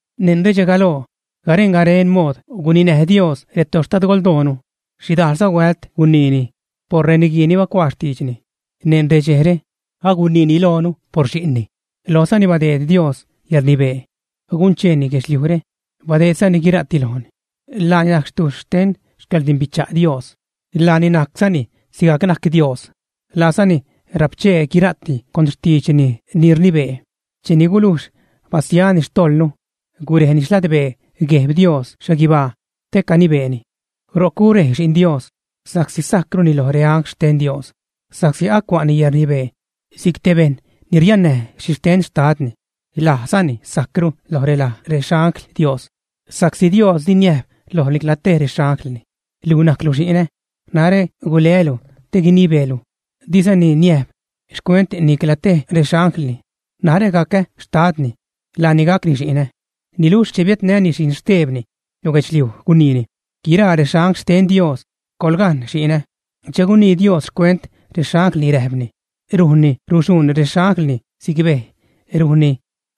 Neṉ redxe galoo garen-garen mood guninäj Dios retoxtadgoldoonu. Xhidajlza huält guniini por reniguii ni bacuaa xtiidxni. Neṉ redxejre aguniini loonu por Xi'nni, lojzani badeed Dios yäḻrnibee guncheeni guedxliujre, badeedzani guira'ti lojni. Laani najc xtuxh xten xcäḻrdimbicha' Dios, laani najczani sigajc najc Dios, laazani rapchee guira'ti con xtiidxni ni rnibee. Cheni gulujx basiani xtojḻnu, gurejni xladbee Gueb Dios xhaguibaa te canibeeni. Ro'c gurej Xi'n Dios sa'csi sajcruni loj reangl xten Dios, sa'csi acua'ni yäḻrnibee si'c te bejṉ ni riannäj xhixten Xtadni. Lajzani sajcru lo relaj rexangl Dios. Sa'csi Dios di niäjb loj nicla tej rexanglni: Luj najclu Xi'nä. Narä guleälu te guinibeelu. Dizani niäjb xcuent nicla tej rexanglni: Narä gacä xtadni, laani gacni xi'nä. Niluxh che biädnäni Xi'n xtebni lo guedxliuj, guniini: Guiraa rexangl xten Dios, ¡Coḻgaṉ Xi'nä! Che gunii Dios xcuent rexanglni räjpni: Rujnni ruxhuṉ rexanglni si'c bej, rujnni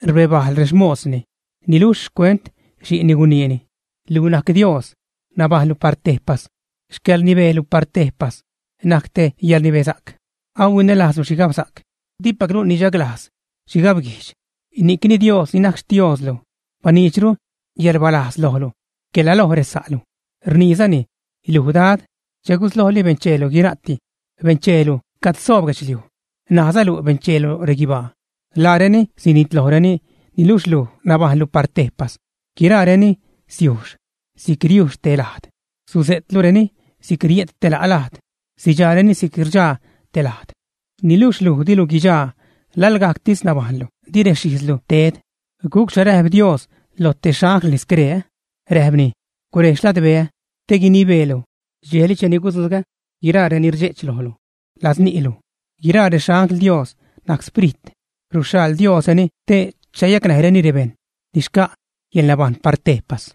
rbebajl rexmosni. Niluxh xcuent Xi'nni guniini: Luj najc Dios. Nabajṉlu par tejpas; xcäḻrnibeelu par tejpas najc te yäḻrnibesa'c. Ahuinälajzlu xhigabsa'c, dipaclu nichaglajz xhigabguijdx, ni'cni Dios ni najc Xtioslu, baniidxru yäḻrbalajz lojlu quela loj resa'lu. Rniizani: Luj, Dad, che guslojli bencheelu guira'ti, bencheelu cad soob guedxliuj, ṉaazalu bencheelu reguibaa. Laareni sinitlojreni, niluxh luj nabajṉlu par tejpas. Guiraareni siujx si'c riujx te lajd. Suse'tlureni si'c rie't te la' lajd, sidxaareni si'c rdxaa te lajd. Niluxh luj dilu guidxaa. Laḻgajctis nabajṉlu, di rexijzlu ted. ¿Gucxha räjp Dios lo te xanglni scree, ä? Räjpni: Gurej xladbeä te guinibeelu dxejli cheni gudzugä guiraa ni rdxe'ch lojlu ladz ni'lu. Guiraa rexangl Dios najc sprit, ruxhaḻ Diosreni te chayacnäjreni rebejṉ ni xca' yäḻnabajṉ par tejpas.